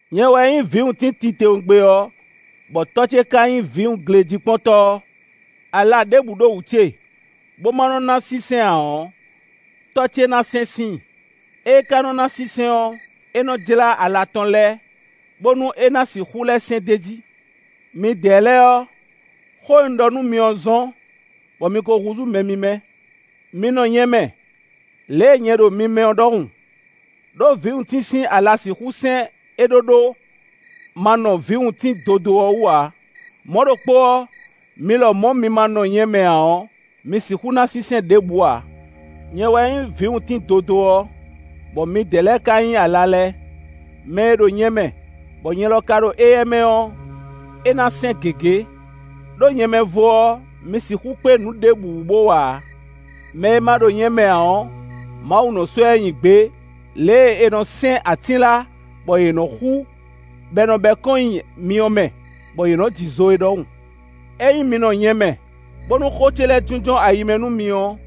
“Nyɛ wɛ nyí vǐwuntín titewungbe ɔ́, bɔ Tɔ́ ce ka nyí vǐwunglejíkpɔ́ntɔ́ ɔ́. Ala ɖěbǔ ɖo wú ce, bó ma nɔ ná sínsɛ́n ǎ ɔ́, tɔ́ ce nɔ sɛ́n síin; ée ka nɔ́ ná sínsɛ́n ɔ́, é nɔ́ jlá ala tɔn lɛ́ɛ bónú é ná sixú lɛ́ sɛ́n d'é jí. Midɛɛ lɛ́ɛ ɔ́, xó e un ɖɔ nú mi ɔ́ zɔ́n, bɔ mi ko húzú mɛ mímɛ́. Mi nɔ nyɛ mɛ, lě e nyɛ ɖo mi mɛ ɔ́ ɖɔhun, ɖó vǐwuntín sín ala sixú sɛ́n é ɖóɖó, ma nɔ vǐwuntín dodó ɔ́ wú ǎ; mɔ̌ ɖokpó ɔ́, mi lɔmɔ̌ mi ma nɔ nyɛ mɛ ǎ ɔ́, mi sixú ná sínsɛ́n ɖěbǔ ǎ. “Nyɛ wɛ nyí vǐwuntín dodó ɔ́, bɔ midɛɛ lɛ́ɛ ka nyí ala lɛ́ɛ. Mɛ e ɖo nyɛ mɛ, bɔ nyɛ lɔ ka ɖo éyɛ́ mɛ ɔ́, é ná sɛ́n gěgé. Đó nyɛ mɛ vo ɔ́, mi sixú kpé nǔ ɖěbǔ wú bo wa ǎ. Mɛ e ma ɖo nyɛ mɛ ǎ ɔ́, Mawu nɔ sɔ́ ɛ nyi gbě lě e è nɔ sɛ́n atínla, bɔ yě nɔ xú, bɔ è nɔ bɛ́ kɔn nyi myɔ mɛ, bɔ yě nɔ ji zo é ɖɔhun. Ényí mi nɔ nyɛ mɛ, bónú xó ce lɛ́ɛ jínjɔ́n ayi mɛ nú mi ɔ́,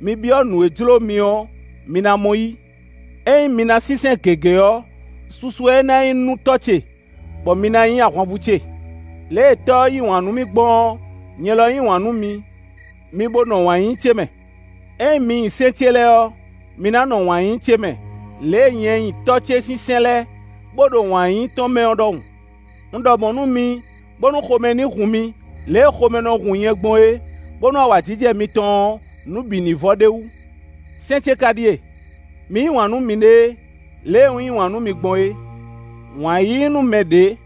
mi byɔ́ nǔ e jló mi ɔ́, mi ná mɔ yí. Ényí mi ná sínsɛ́n gěgé ɔ́, susu wɛ é ná nyí nú Tɔ́ ce, bɔ mi ná nyí ahwanvú ce. Lě e Tɔ́ ɔ́ yí wǎn nú mì gbɔn ɔ́, nyɛ lɔ un yí wǎn nú mi; mi bo nɔ wǎn yíyí ce mɛ. Ényí mi nyi sɛ́n ce lɛ́ɛ ɔ́, mi ná nɔ wǎn yíyí ce mɛ, lě e nyɛ nyi Tɔ́ ce sín sɛ́n lɛ́ɛ, bó ɖo wǎn yíyí tɔn mɛ ɔ́ ɖɔhun. “Un ɖɔ mɔ̌ nú mi, bónú xomɛ ní hun mi, lě e xomɛ nɔ hun nyɛ gbɔn é, bónú awǎjijɛ mitɔn ɔ́, nǔ bǐ ní vɔ ɖ'é wú. Sɛ́n ce ka ɖíe: mi yí wǎn nú miɖée, lě e un yí wǎn nú mi gbɔn é. Wǎn yíyí nú mɛ ɖě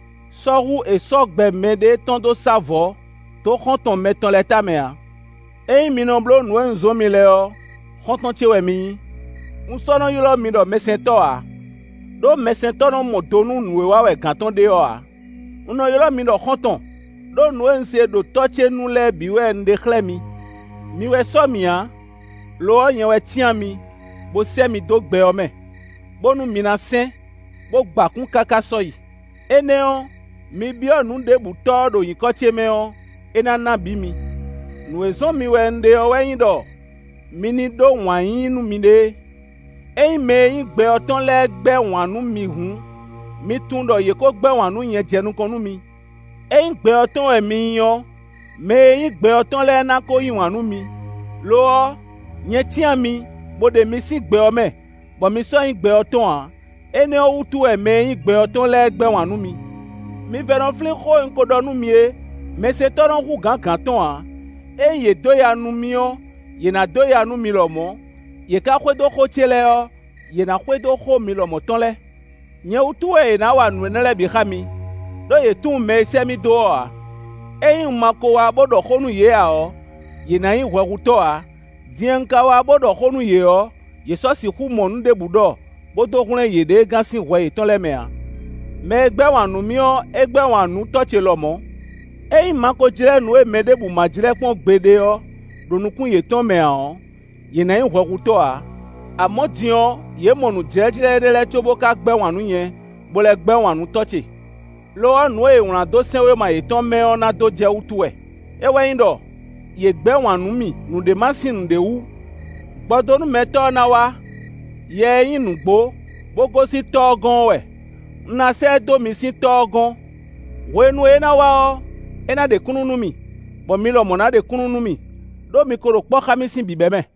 sɔ́ hú è sɔ́ gbɛ mɛɖée tɔn dó sá vɔ̌ dó xɔ́ntɔn mɛtɔn lɛ́ɛ tamɛ ǎ. Ényí mi nɔ bló nǔ e un zɔ́n mi lɛ́ɛ ɔ́, xɔ́ntɔn ce wɛ mi nyí. Un sɔ́ nɔ ylɔ́ mi ɖɔ mɛsɛntɔ́ ǎ, ɖó mɛsɛntɔ́ nɔ mɔ do nú nǔ e wa wɛ gǎn tɔn ɖe ɔ́ ǎ. Un nɔ ylɔ́ mi ɖɔ xɔ́ntɔn, ɖó nǔ e un se ɖo Tɔ́ ce nu lɛ́ɛ bǐ wɛ un ɖe xlɛ́ mi. Mi wɛ sɔ́ mì ǎ; lo ɔ́, nyɛ wɛ cyán mi, bó sɛ́ mi dó gbɛ ɔ́ mɛ, bónú mi ná sɛ́n, bó gba kún káká sɔ́yi; énɛ́ ɔ́, mi byɔ́ nǔ ɖěbǔ Tɔ́ ɔ́ ɖo nyǐkɔ ce mɛ ɔ́, é ná ná bǐ mi. Nǔ e zɔ́n mi wɛ un ɖe ɔ́ wɛ nyí ɖɔ mi ní ɖó wǎn yíyí nú miɖée.” “Ényí mɛ e nyí gbɛ ɔ́ tɔn lɛ́ɛ gbɛ́ wǎn nú mi hǔn, mi tunwun ɖɔ yě ko gbɛ́ wǎn nú nyɛ jɛ nukɔn nú mi. Ényí gbɛ ɔ́ tɔn wɛ mi nyí ɔ́, mɛ e nyí gbɛ ɔ́ tɔn lɛ́ɛ na ko yí wǎn nú mi. Lo ɔ́, nyɛ cyán mi, bó ɖe mi sín gbɛ ɔ́ mɛ, bɔ mi sɔ́ nyí gbɛ ɔ́ tɔn ǎ; énɛ́ ɔ́ wútu wɛ mɛ e nyí gbɛ ɔ́ tɔn lɛ́ɛ gbɛ́ wǎn nú mi. Mi vɛ́ nɔ flín xó e un ko ɖɔ nú mi é: ‘Mɛsɛntɔ́ nɔ hú gǎn gǎn tɔn ǎ.’ Ényí yě dó ya nú mì ɔ́, yě ná dó ya nú mi lɔmɔ̌; yě ká xwedó xó ce lɛ́ɛ ɔ́, yě ná xwedó xó mi lɔmɔ̌ tɔn lɛ́ɛ. Nyɛ wútu wɛ è nǎ wa nǔ énɛ́ lɛ́ɛ bǐ xá mi, ɖó yě tunwun mɛ e sɛ́ mì dó ɔ́ ǎ. Ényí un ma ko wá, bó ɖɔ xó nú yě ǎ ɔ́, yě ná nyí hwɛhutɔ́ ǎ; din e un ka wá, bó ɖɔ xó nú yě ɔ́, yě sɔ́ sixú mɔ nǔ ɖěbǔ ɖɔ, bó dó hwlɛ́n yěɖée gán sín hwɛ yětɔn lɛ́ɛ mɛ ǎ. Mɛ e gbɛ́ wǎn nú mì ɔ́, é gbɛ́ wǎn nú Tɔ́ ce lɔmɔ̌. Ényí un ma ko jlɛ́ nǔ e mɛ ɖěbǔ ma jlɛ́ kpɔ́n gbeɖé ɔ́ ɖo nukún yětɔn mɛ ǎ ɔ́, yě ná nyí hwɛhutɔ́ ǎ. Amɔ̌, din ɔ́, yě mɔ nǔjlɛ́jlɛ́ énɛ́ lɛ́ɛ có bó ka gbɛ́ wǎn nú nyɛ, bó lɛ́ gbɛ́ wǎn nú Tɔ́ ce. Lo ɔ́, nǔ e è wlán dó sɛ́nwéma yětɔn mɛ ɔ́ ná dó jɛ wútu wɛ; é wɛ nyí ɖɔ: ‘Yě gbɛ́ wǎn nú mì nǔɖé ma sín nǔɖé wú.’ “Gbɔdónúmɛtɔ́ ɔ́ ná wá. Yɛ e nyí nǔgbó, bó gosín Tɔ́ ɔ́ gɔ́n ɔ́ wɛ. Un ná sɛ́ ɛ dó mi sín Tɔ́ ɔ́ gɔ́n. Hwenu e é ná wá ɔ́, é ná ɖe kúnnu nú mì; bɔ mi lɔmɔ̌ ná ɖe kúnnu nú mì, ɖó mi ko ɖo kpɔ́ xá mì sín bǐbɛ́mɛ.